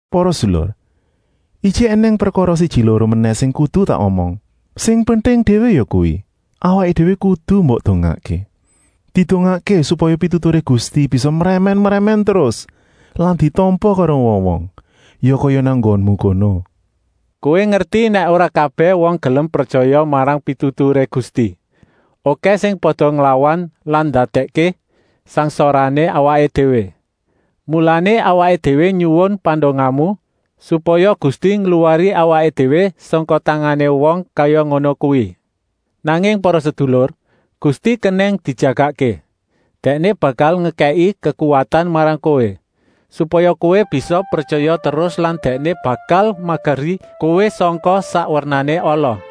Para sedulur, ijik ènèng prekara siji-loro menèh sing kudu tak omong. Sing penting déwé yakuwi, awaké déwé kudu mbok dongaké. Didongakké supaya pituturé Gusti bisa mrèmèn-mrèmèn terus lan ditampa karo wong-wong, ya kaya nang nggonmu kono. Kowé ngerti nèk ora kabèh wong gelem pretyaya marang pituturé Gusti. Okèh sing pada nglawan lan ndadèkké sangsarané awaké déwé. Mulané, awaké déwé nyuwun pandongamu, supaya Gusti ngluwari awaké déwé sangka tangané wong kaya ngono kuwi. Nanging para sedulur, Gusti kenèng dijagakké. Dèkné bakal ngekèki kekuwatan marang kowé, supaya kowé bisa pretyaya terus lan Dèkné bakal mageri kowé sangka sak wernané ala.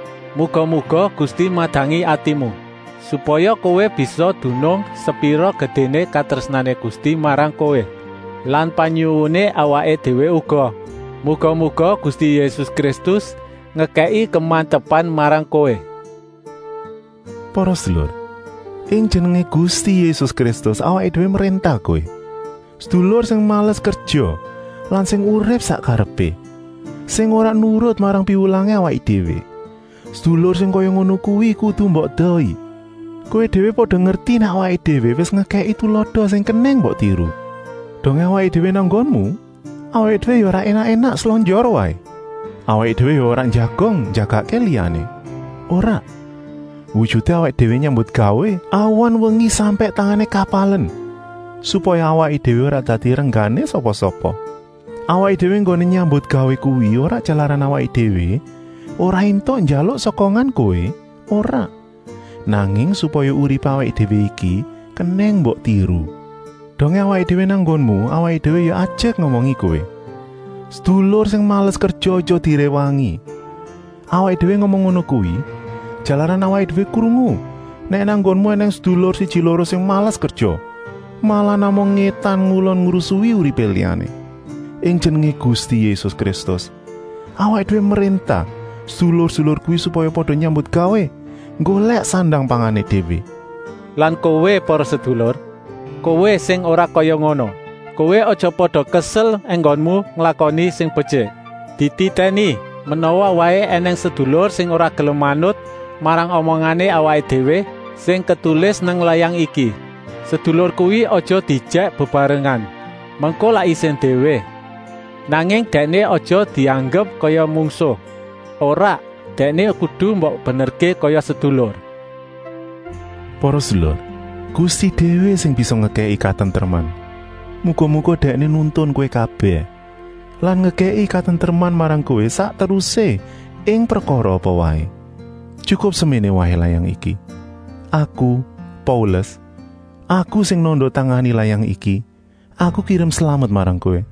Muga-muga Gusti madangi atimu, supaya kowé bisa dunung sepira gedéné katrésnané Gusti marang kowé lan panyuwuné awaké déwé uga, muga-muga Gusti Yésus Kristus ngekèki kemantepan marang kowé. Para sedulur, ing jenengé Gusti Yésus Kristus awaké déwé mréntah kowé: sedulur sing males kerja lan sing urip sak karepé, sing ora nurut marang piwulangé awaké déwé, sedulur sing kaya ngono kuwi kudu mbok edohi. Kowé déwé pada ngerti nèk awaké déwé wis ngekèki tulada sing kenèng mbok tiru. Dongé awaké déwé nang nggonmu awaké déwé ya ora énak-énak slonjor waé. Awaké déwé ya ora njagong njagakké liyané, ora. Wujuté awaké déwé nyambutgawé awan-wengi sampèk tangané kapalen, supaya awaké déwé ora dadi renggané sapa-sapa. Awaké déwé enggoné nyambutgawé kuwi ora jalaran awaké déwé ora éntuk njaluk sokongan kowé, ora, nanging supaya uripé awaké déwé iki kenèng mbok tiru. Dongé awaké déwé nang nggonmu awaké déwé ya ajek ngomongi kowé: sedulur sing males kerja aja diréwangi. Awaké déwé ngomong ngono kuwi, jalaran awaké déwé krungu nèk nang nggonmu ènèng sedulur siji-loro sing males kerja, malah namung ngétan-ngulon ngrusui uripé liyané. Ing jenengé Gusti Yésus Kristus awaké déwé mréntah sedulur-sedulur kuwi supaya pada nyambutgawé nggolèk sandang-pangané déwé. Lan kowé, para sedulur, kowé sing ora kaya ngono, kowé aja pada kesel enggonmu nglakoni sing betyik. Dititèni, menawa waé ènèng sedulur sing ora gelem manut marang omongané awaké déwé sing ketulis nang layang iki. Sedulur kuwi aja diejèk bebarengan, mengko lak isin déwé. Nanging dèkné aja dianggep kaya mungsuh, ora, dèkné kudu mbok benerké kaya sedulur. Para sedulur, Gusti déwé sing bisa ngekèki katentreman. Muga-muga Dèkné nuntun kowé kabèh lan ngekèki katentreman marang kowé sak terusé ing prekara apa waé. Tyukup seméné waé layang iki. Aku, Paulus, aku sing nanda-tangani layang iki, aku kirim slamet marang kowé.